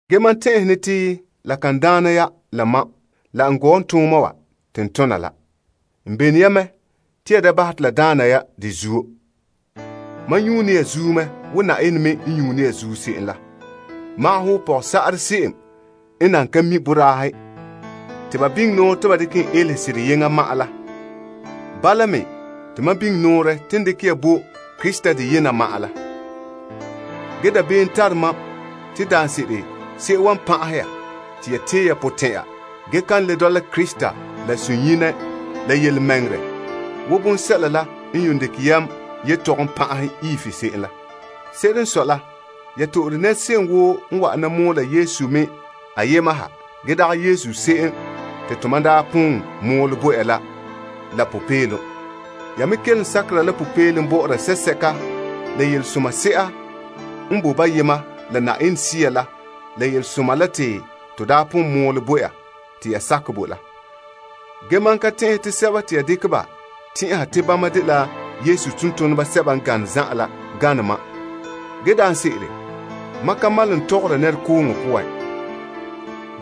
Ge mam tɛn'ɛhe ne te la kan daana ya la mam, ge n gɔɔntooma wa te n tona la. N belone ya mɛ te ya da bahɛ te la daana ya de zuo. Mam nyuune ya zuo mɛ wo Na'ayenɛ me n nyuune ya zuo se'em la. Wo ya dela pɔgɔsa'arɛ se'em n nan ka mi' boraahe te ba biŋe nɔɔrɛ te ba dekɛ en elehe sera la. Bala me te mam biŋe nɔɔrɛ te n dekɛ bo Krista deyena ma'an la. Ge dabeem tara mam te daanse'ere se'em wan pan'ahɛ ya te ya tee ya potɛn'ya ge kan le dɔla Krista la sunyenɛ la yelemɛŋɛrɛ wo bonsɛla la n yuun dekɛ yam yetɔgom pan'ahɛ Eve se'em la. Se'ere n sɔe la, ya to'ore se'em woo n wa'ana mɔɔla Yesu me ayema ha ge dagɛ Yesu se'em te to mam daa pon mɔɔlɛ bo ya la popeelom. Ya me kelom sakera la popeelom bɔ'ɔra sea sɛka la yelesoma se'a n boe boyema la Yenɛ Sea la la Yelesoma la te to daa poan mɔɔlɛ bo ya te ya sakɛ bo la. Ge mam ka tɛn'ɛhɛ te sɛba te ya dekɛ ba tɛn'ɛha te bama dela Yesu tontoneba sɛba n gane zan'an la gane mam. Ge daanse'ere mam ka malom n tɔgɔra nɛrekooŋɔ poan.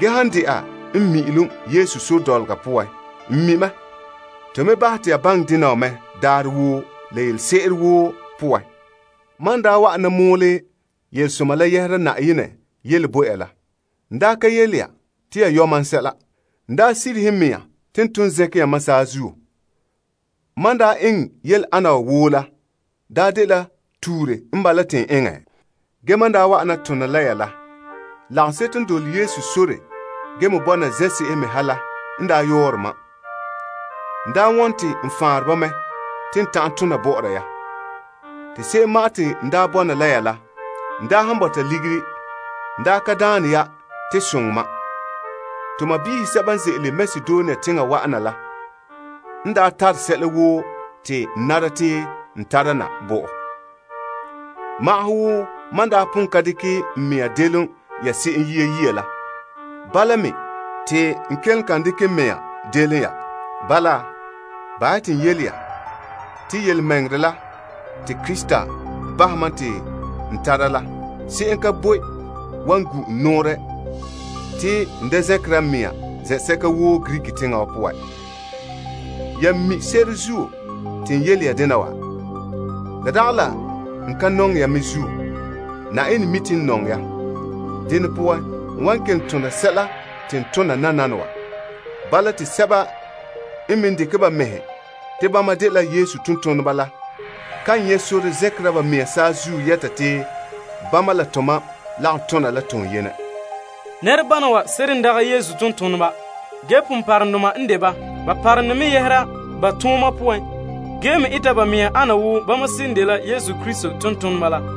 Ge, han de'a n mi'ilom Yesu sore dɔlɔga poan, n mi mɛ. To me bahɛ te ya baŋɛ dena wa mɛ daarɛ woo la yelese'ere woo poan. Mam n daa wa'ana mɔɔlɛ Yelesoma la yɛhera Na'ayenɛ yele bo ya la, n daa ka yele ya te ya yɔ' mam sɛla. Ge n daa sirihe n mɛŋa te n ton zɛnkɛ yamam saazuo. Mam n daa eŋɛ yele ana wa woo la daa dela tuure n bala te n eŋɛ? Ge mam n daa wa'ana tona la ya, lagaŋseto n dole Yesu sore ge me bɔna zen'se'ehe me ha la n daa yɔɔre mam. N daa wone te n faanre ba mɛ te n ta'an tona bɔ'ɔra ya. Te se'em ma'an te n daa bɔna la ya la, n daa han bɔta ligiri n daa ka daane ya te soŋɛ mam. To sɔɔnrɔ sɛba n ze'ele Makedonia teŋa wa'ana la n daa tare sɛla woo te n nara te a tara na bo mam. Wo mam n daa pon ka dekɛ n mɛŋa delom ya se'em yia la, bala me te n kelom kan dekera n mɛŋa delom ya. Bala, bahɛ ya te n yele ya te yelemɛŋɛrɛ la te Krista bahɛ mam te n tara la, se'em ka boe wan gu' n nɔɔrɛ te n da zɛnkera n mɛŋa zen'sɛka woo Greek teŋa poan. Ya mi se'ere zuo te n yele dena wa? La dagɛ la n ka nɔŋɛ ya me zuo. Na'ayenɛ mi te n nɔŋɛ ya. Dene poan, n wan kelom tona sɛla te n tona nananawa. Bala te sɛba n me dekɛ ba mɛhe te bama dela Yesu tontoneba la kan nyɛ sore zɛnkera ba mea saazuo yɛta te bama la tomam lagom tona la toonyenɛ. Nɛrebana wa seren dagɛ Yesu tontoneba, ge ponpɔrɔŋdoma n de ba. Ba parom ne mɛ yɛhera ba tooma poan ge me eta ba mɛhe ana wo bama seren dela Yesu Krista tontoneba la.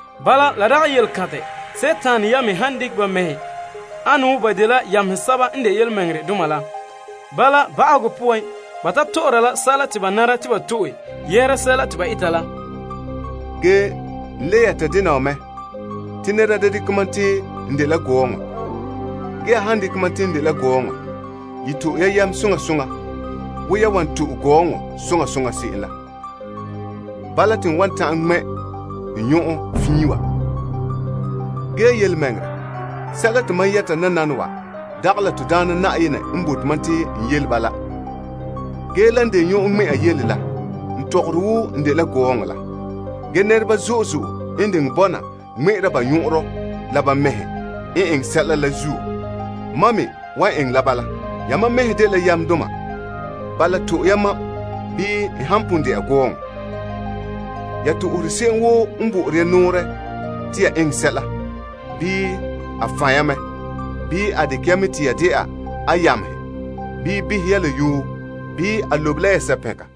Bala, la dagɛ yelekantɛ Dima yamehe han dekɛ ba mɛhe ana wo ba dela yamehe sɛba n de yelemɛŋɛrɛdoma la. Bala ba'ahegɔ poan, ba ta tɔ'ɔra la sɛla te ba nara te ba to'e yɛhera sɛla te ba eta la. Ge n le yɛta dena wa mɛ te nɛra da dekɛ mam te n dela gɔɔŋɔ. Ge ya han dekɛ mam te n dela gɔɔŋɔ, ye to'e ya mam soŋa soŋa wo ya wan to'e gɔɔŋɔ soŋa soŋa se'em la. Bala te n wan ta'an ŋmɛ' n nyɔn'ɔn fiin wa. Ge yelemɛŋɛrɛ, sɛla te mam yɛta nananawa, dagɛ la to Daana Na'ayenɛ n bote mam te n yele bala. Ge lan de nyɔn'ɔn ŋmɛ'an yele la n tɔgɔrɛ wo n dela gɔɔŋɔ la. Ge nɛreba zo'e zo'e n diŋɛ bɔna ŋmɛ'ɛra ba nyɔn'ɔnrɔ la ba mɛhe n eŋɛ sɛla la zuo mam me wan eŋɛ la bala. Yamam mɛhe dela yamdoma. Bala, to'e ya mam, bii n han pon dɛna gɔɔŋɔ. Ya to'ohere se'em woo n bo'ore ya nɔɔrɛ te ya eŋɛ sɛla, bii a fan' ya mɛ, bii a dekɛ ya mɛ te ya dɛna a yamehe, bii behɛ ya la yoo, bii a lobe la ya sapɛnka.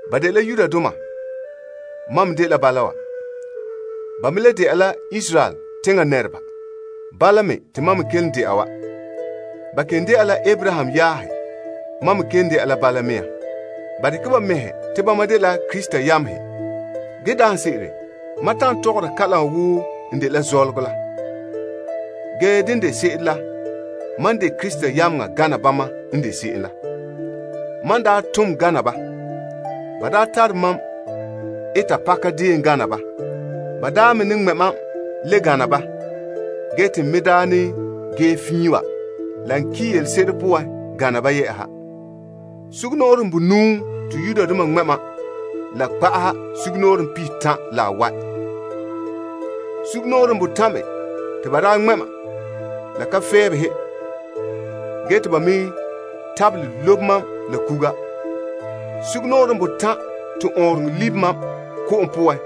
Ba dela Yudoma. Mam me dela bala. Ba me le dɛna la Israel teŋa nɛreba. Mam me dela bala. Ba dela Abraham yaahe. Mam me kelom dɛna la bala. Ba dekɛ ba mɛhe te bama dela Krista yamehe. Ge daanse'ere mam tɔgɔre wo n dela zɔlɔgɔ la. Dene de se'ere la, mam de Krista yameŋa gana bama n de se'em la. Mam n daa tom gana ba. Ba daa tare mam eta pakadeen gana ba. Ba daa me ne ŋmɛ' mam le gana ba ge te n me daa ne ge fiin wa la n ki' yelese'ere poan gana ba yɛ'ɛha. Sugumnɔɔren bonuu te Yudoma ŋmɛ' mam la kpa'aherɛ sugumnɔɔren pihitan' la bawae'. Sugumnɔɔren botan' me te ba daa ŋmɛ' mam la ka fɛɛn behe gee te ba me tabelɛ lobe mam la kuga. Sugumnɔɔren botan' te ɔɔnrɔŋɔ libe mam ko'om poan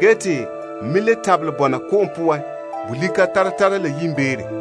ge te n me le tabelɛ bɔna ko'om poan bolika tara tara la yiimbeere.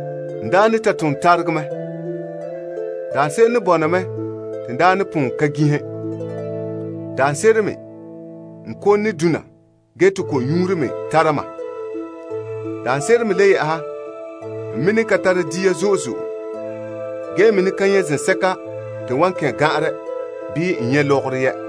N daa ne ta tom ne ta taregɛ. Daanse'ere ne bɔna mɛ te n daa ne pon ka ginhe. Daanse'ere me n kom ne dona te ko'nyuuro me tara mam. Daanse'ere me le yɛ'ɛha, n me ne ka tara dia zo'e zo'e ge ne ka nyɛ' zen'an te n wan kɛn' gan'anrɛ bii n nyɛ' lɔgɔrɔ yɛ'.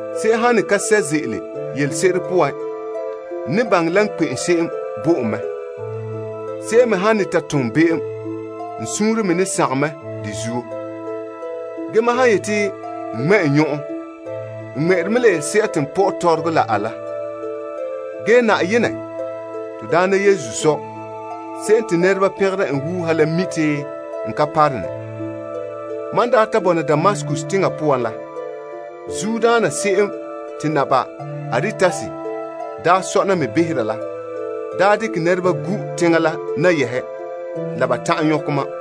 Se'em han ne ka sɛ' ze'ele yelese'ere poan, n ne baŋɛ la kpe'em se'em bo en mɛ. Se'em me han ne ta tom be'em, n suunre me ne sagom mɛ de zuo. Ge mam han yete n ŋmɛ' n nyɔn'ɔn, n ŋmɛ'ɛre mɛ la yelese'a te n pɔ'ɛ tɔrɔgɔ la a la. Ge Na'ayenɛ, to Daana Yesu Sɔ' se'em te nɛreba pɛngera en wuuha la mi te n ka parone. Mam n daa ta bɔna Damaskus teŋa poan la, Naba Aretas bahɛ te teŋbehera la daa dekɛ nɛreba gu' teŋa la nayahe la ba ta'an nyɔkɛ mam.